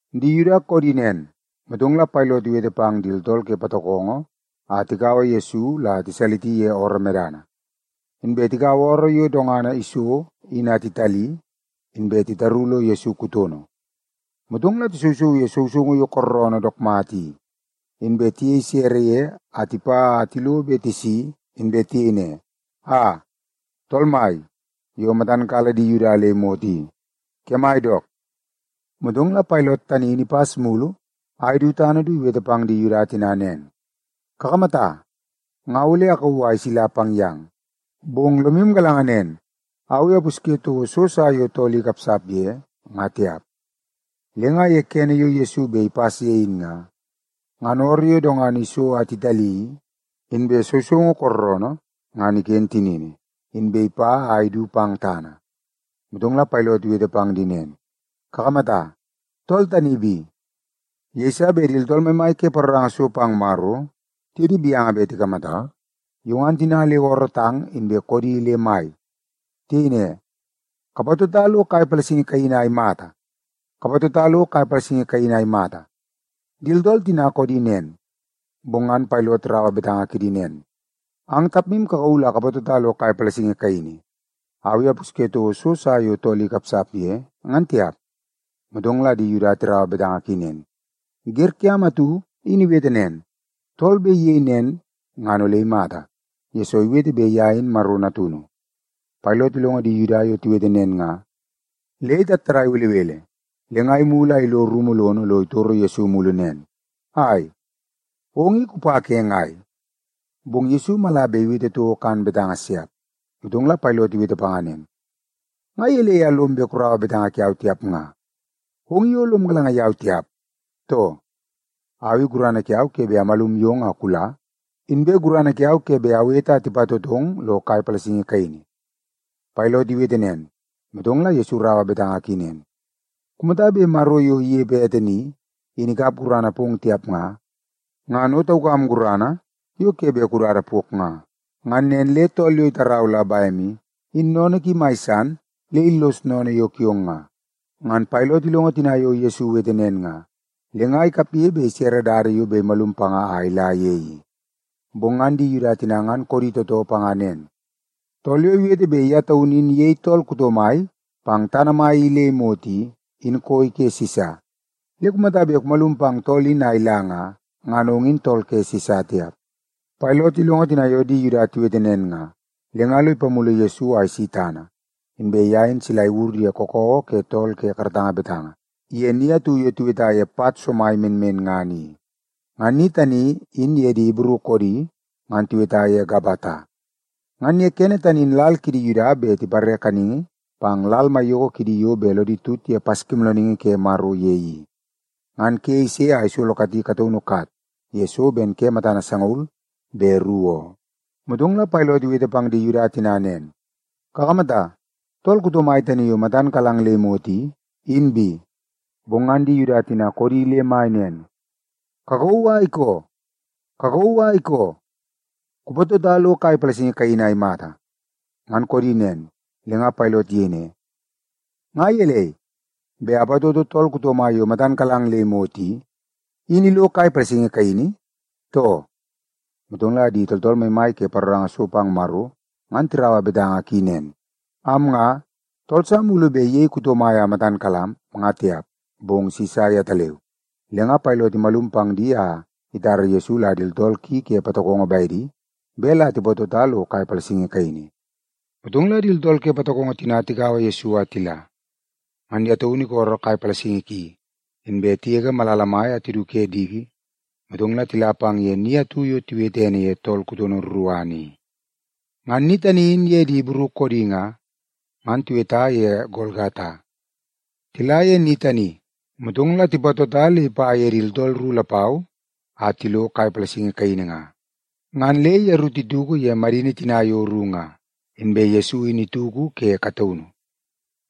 Di Yuda koodi nen, motong la Pailot iwete pang di tooltool ke patokongo a tikaua Yesu la tiwalisi ye ooroo medana. Inbe tikaua ooroo yo dongana iso in a titali, inbe titaru lo Yesu kutono. Motong la tisousouu ye sousoungu yo kooroonoo dook mata i, inbe tiyei sere ye a tipa a tilo be tisi inbe tiyei ne, “Aa, tool mai yo matam kala di Yuda le imot i, kemai dook!” Motong la Pailot tani in ipas mulu a idu tana du iwete pang di Yuda tina nen, “Kakamata, nga ole akauu a isila pang yang, bong lomu galanga nen, au i apusye toko so sa yo tool i ikapsap ye, nga tiap.” Le nga ye kene yo Yesu bet ipas ye in nga, ngan ooroo yo dongana iso a titali i, inbe sousoungu kooroonoo ngan iken tinini, inbe ipa ye a idu pang tana. Motong la Pailot iwete pang di nen, “Kakamata, tool tani bi!” Yeiso bet di tooltool maimai ke paroranga so pang Maro tiye di gaunu bet tikamata, yo ngan tina le oorootang inbe koodi le mai. Tiyei ne, “Kapatota lo kai palasingi kaini a imata! Kapatota lo kai palasingi kaini a imata!” Di tooltool tina koodi nen, bong ngan Pailot iraua betanga kidi nen, “Ang tapmu kakauu la kapatota lo kai palasingi kaini. Au i apusye toko so sa yo tool i ikapsap ye, ngan tiap.” Motong la di Yuda tina ngan tiraua betanga ki nen, “Wer kiam atu in iwete nen, tool bet iyei nen ngan ole imata, yesoo iwete bet ye in Maro Natunu.” Pailot ilongo di Yuda yo tiwete nen nga, le itattadai belebele. Le nga imulu a ilo rumu lono lo itoro Yesu mulu nen, “Ai, ong i kupa ke ngai?” Bong ngan Yesu mala bet iwete toko kan betanga siap. Motong la Pailot iwete panga nen, “Nga gelei a lom bet kuraua betanga kiau tiap nga? Ong i o lom galanga yau tiap, too? Au i gurana kiau ke bet amalum yong a kula, inbe gurana kiau ke bet awete a tipatotong lo kai palasingi kaini.” Pailot iwete nen, motong la Yesu iraua betanga ki nen, “Kumata bet Maro yo inepe ete ni, in ikap gurana pong tiap nga, ngan o taukam gurana yo ke bet kudada pok nga. Ngan nen le tool yo itarau la bem i, in sennene ki mai san le illos sennene yo kiong nga.” Ngan Pailot ilongo tina yo Yesu iwete nen nga, le nga ikapge bet isere dada yo bet imalum panga a ila ye i. Bong ngan di Yuda tina ngan koodi tootoo panga nen, “Tool yo iwete bet ye taunu in iyei tool kuto mai pang tana i le imot i, in koi ke Sisa. Le kumata bet kumalum pang tool in a ila nga, ngan ong in tool ke Sisa tiap.” Pailot ilongo tina yo di Yuda tiwete nen nga, le nga lo ipamulu Yesu a isi tana, inbe ye in sila iwur ye kakawa ke tool ke karatanga betanga, ye ni atu yo tiweta ye Pat Somai Menmenngana i. (Ngan ni tani in ye di Ibru koodi ngan tiweta ye Gabata.) Ngan ye kene tani in lal kidi Yuda bet tipare kaningi pang lal maiyoko kidi yo bet lodi tut ye Paskimoolooningi Ke Maro ye i. Ngan ke ise a isolo kati kataunu kat ye so ben ke matana sangaul be ru oo. Motong la Pailot iwete pang di Yuda tina nen, “Kakamata, tool kuto mai tani yo matan kalang le imot i, in bi.” Bong ngan di Yuda tina koodi le mai nen, “Kakauu a ikoo! Kakauu a ikoo! Kupatota lo kai palasingi kaini a imata!” Ngan koodi nen, le nga Pailot iyei ne, “Nga gelei, bet apatoto tool kuto mai yo matan kalang le imot i, in ilo kai palasingi kaini, too?” Motong la di tooltool maimai ke paroranga so pang Maro ngan tiraua betanga ki nen, “Am nga, tool sa mulu bet iyei kuto mai a matan kalam, nga tiap, bong Sisa yetaleu.” Le nga Pailot imalum pang di a itara Yesu la di tooltool ki ke patokongo bedi bet la tipatota lo kai palasingi kaini. Motong la di tooltool ke patokongo tina tikaua Yesu a tila. Ngan ye taunu isolo kai palasingi ki, inbe tigege malala mai a tidu ke diki, motong la tila pang ye ni atu yo tiwete ene ye Tool Kutono Ruruana i. (Ngan ni tani in ye di Ibru koodi nga, ngan tiweta ye Golgata). Tila ye ni tani, motong la tipatota le ipa ye di tooltool ru lapau a tilo kai palasingi kaini nga. Ngan le yeru tituku ye madini tina yo ru nga, inbe Yesu in ituku ke kataunu.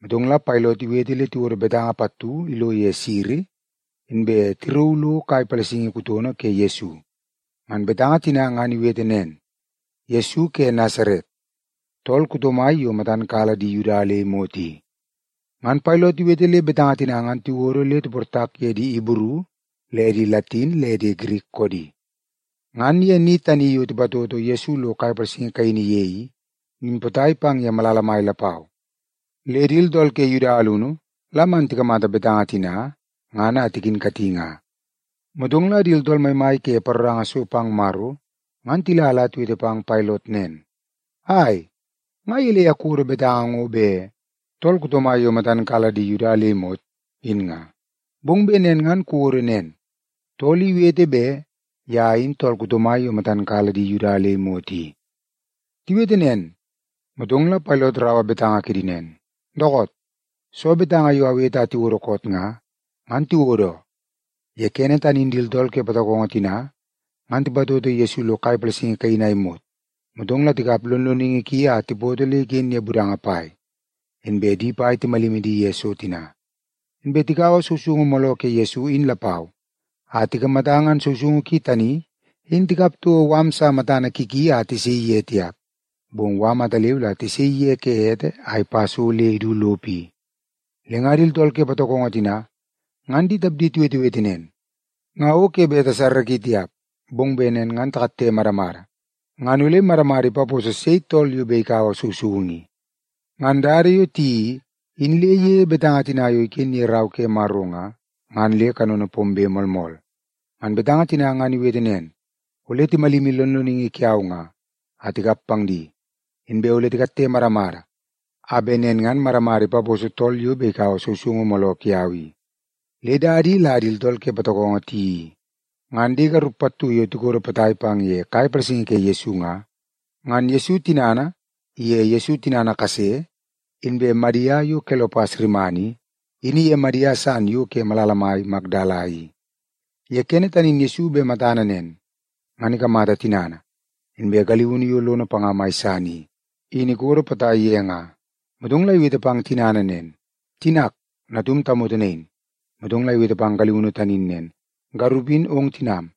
Motong la Pailot iwete le tiwodo betanga pattu ilo ye siri, inbe tirauu lo kai palasingi kutono ke Yesu. Ngan betanga tina ngan iwete nen: Yesu Ke Nasaret, Tool Kuto Mai Yo Matan Kala Di Yuda Le Imot I. Ngan Pailot iwete le betanga tina ngan tiwodo le tiportak ye di Ibru le di Latin le di Girik koodi. Ngan ye ni tani yo tipatoto Yesu lo kai palasingi kaini ye i, in potai pang ye malala mai lapau. Le di tooltool ke Yuda alunu la man tikamata betanga tina ngan a tikinkati nga. Motong la di tooltool maimai ke paroranga so pang Maro ngan tila la tiwete pang Pailot nen, “Ai, nga gelei a kuwodo betanga ngo bet ‘Tool Kuto Mai Yo Matan Kala Di Yuda Le Imot,’ in nga? Bong bet nen ngan kuwodo nen, ‘Tool I Iwete Bet Ye In Tool Kuto Mai Yo Matan Kala Di Yuda Le Imot I.’” Tiwete nen, motong la Pailot iraua betanga kidi nen, “Dookoot, soo betanga yo awete a tiwodo koot nga, ngan tiwodo oo.” Ye kene tani in di tooltool ke patokongo tina ngan tipatoto Yesu lo kai palasingi kaini a imot, motong la tikap lonloningi ki a tipoto le iken ye budanga pai. Inbe di pai timalimi di ye so tina. Inbe tikaua sousoungu mooloo ke Yesu in lapau a tikamata ngan sousoungu ki tani in tikap toko mala sa matana ki ki a tisaii ye tiap, bong mala ataleu la tisaii ye ke ete a ipa so le idu lopo i. Le nga di tooltool ke patokongo tina ngan di tapdi tiwetewete nen, “Nga o ke bet tasarraki tiap. Bong bet nen ngan takatte madamada ngan ole madamada ipaposo sei tool yo bet ikaua sousoungu i.” Ngan dada yo tiyeii i, in le iyei betanga tina yo iken ye Rau ke Maro nga, ngan le kanono pombe moolmool. Ngan betanga tina ngan iwete nen, “Ole timalimi lonloningi kiau nga, a tikap pang di. Inbe ole titoo moomoo kidi a tikatte madamada a bet nen ngan madamada ipaposo tool yo bet ikaua sousoungu mooloo kiau i.” Le dada i la di tooltool ke patokongo tiyeii i. Ngan di garup pattu yo tikodo potai pang ye kai palasingi ke Yesu nga, ngan Yesu tinana, iye Yesu tinana kase, inbe Madia yo Kelopas rimana i, in iye Madia san yo ke malala mai Makdala i. Ye kene tani in Yesu bet matana nen, ngan ikamata tinana, inbe galiunu yo lono panga mai san i, in ikodo potai ye nga. Motong la iwete pang tinana nen, “Tinak, natum tamoto nain.” Motong la iwete pang galiunu tani in nen, “Garup in ong tinam.”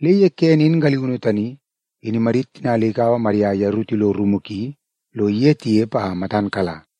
Le ye kene in galiunu tani, in imadit tina le ikaua Madia a yeru tilo rumu ki lo iye tinepe a matan kala.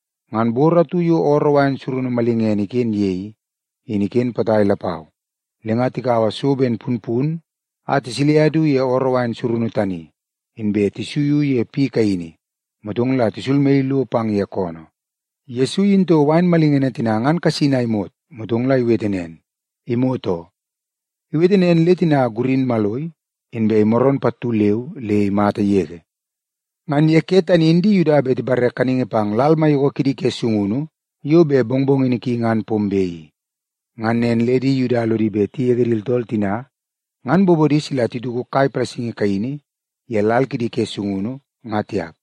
Ngan bor atu yo ooroo wain surunu malingene iken ye i, in iken potai lapau. Le nga tikaua so ben punpun a tisilia du ye ooroo wain surunu tani, inbe tisuiu ye piu kaini, motong la tisulmaii lo pang ye koonoo. Yesu iyini toko wain malingene tina ngan kasin a imot, motong la iwete nen, “Imot oo.” Iwete nen le tina gurin maloi, inbe imaroon pattu leu le imata yege. Ngan ye ke tani in di Yuda bet tipare kaningi pang lal maiyoko kidi ke sungunu yo bet mongmongini ki ngan pombe i. Ngan nen le di Yuda lodi bet tigege di tooltool tina ngan bobodi sila tituku kai palasingi kaini ye lal kidi ke sungunu, nga tiap.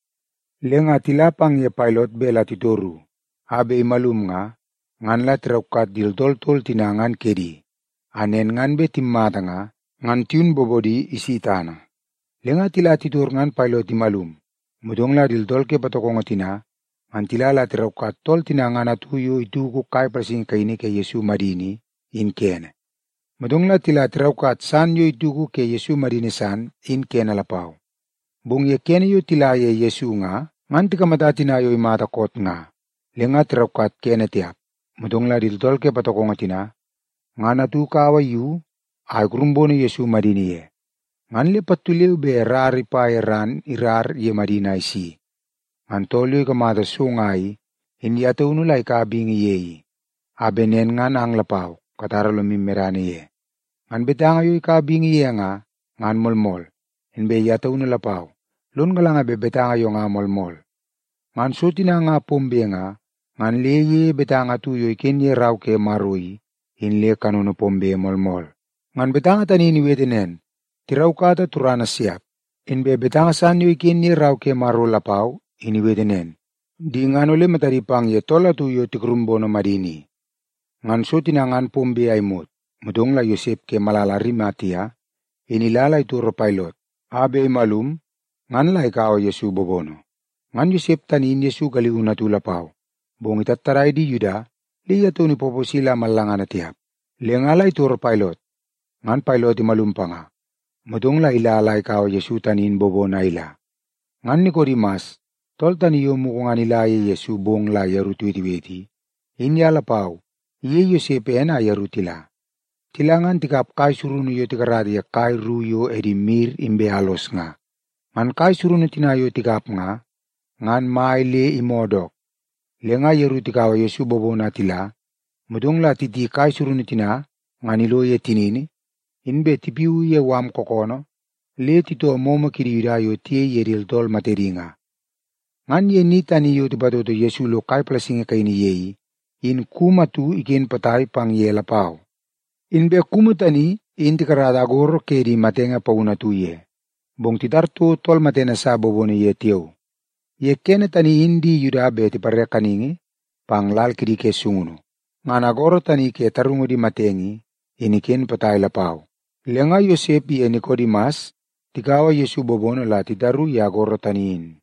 Le nga tila pang ye Pailot bet la titoru a bet imalum nga, ngan la tiraukat di tooltool tol tina ngan kedi, a nen ngan bet timmata nga, ngan tiyun bobodi isi tana. Le nga tila titor ngan Pailot imalum, motong la di tooltool ke patokongo tina ngan tila la tiraukat tool tina ngan atu yo ituku kai palasingi kaini ke Yesu madini i, in kene. Motong la tila tiraukat san yo ituku ke Yesu madini san, in kene lapau. Bong ye kene yo tila ye Yesu nga, ngan tikamata tina yo imata koot nga, le nga tiraukat kene tiap. Motong la di tooltool ke patokongo tina, ngan atu ikaua yu a ikurumbono Yesu madini ye. Ngan le pattu leu be rara ipa ye ran irara ye madini a isi. (Ngan tool yo ikamata so nga i, in ye taunu la ikaua bingi ye i, a bet nen ngan ang lapau katara lomu medana ye. Ngan betanga yo ikaua bingi ye nga, ngan moolmool. Inbe ye taunu lapau, lon galanga bet betanga yo nga moolmool.) Ngan so tina nga pombe nga, ngan le iyeie betanga atu yo iken ye Rau ke Maro i, in le kanono pombe moolmool. Ngan betanga tani in iwete nen, “Tiraukata turana siap.” Inbe betanga san yo iken ye Rau ke Maro lapau, in iwete nen, “Di ngan ole matadi pang ye tool atu yo tikurumbono madini i.” Ngan so tina ngan pombe a imot, motong la Yosep ke malala Arimatia in ila la itoro Pailot a bet imalum ngan la ikaua Yesu bobono. Ngan Yosep tani in Yesu galiunu atu lapau, bong itattadai di Yuda le ye taun ipaposi la mallangana tiap. Le nga la itoro Pailot, ngan Pailot imalum panga, motong la ila la ikaua Yesu tani in bobono a ila. Ngan Nikodimas, tool tani yo mugu ngan ila ye Yesu bong la yeru tiwetewete i, in ye lapau iyei Yosep ene a yeru tila. Tila ngan ikap kai surunu yo tikarata ye kai ru yo edi mir inbe alos nga. Ngan kai surunu tina yo ikap nga, ngan mai le imoo dook. Le nga yeru tikaua Yesu bobono a tila, motong la titi kai surunu tina ngan ilo ye tinini, inbe tipiuu ye mala kookoonoo le titoo momo kidi Yuda yo tiyei ye di tooltool matedi nga. Ngan ye ni tani yo tipatoto Yesu lo kai palasingi kaini ye i, in kumu atu iken potai pang ye lapau. Inbe kumu tani in tikarata agoro ke di matenge paunu atu ye, bong titar toko tool matene sa bobono ye tiao. Ye kene tani in di Yuda bet tipare kaningi pang lal kidi ke sungunu. Ngan agoro tani ke tarungu di matenge i, in iken potai lapau. Le nga Yosep iye Nikodimas tikaua Yesu bobono la titaru ye agoro tani in.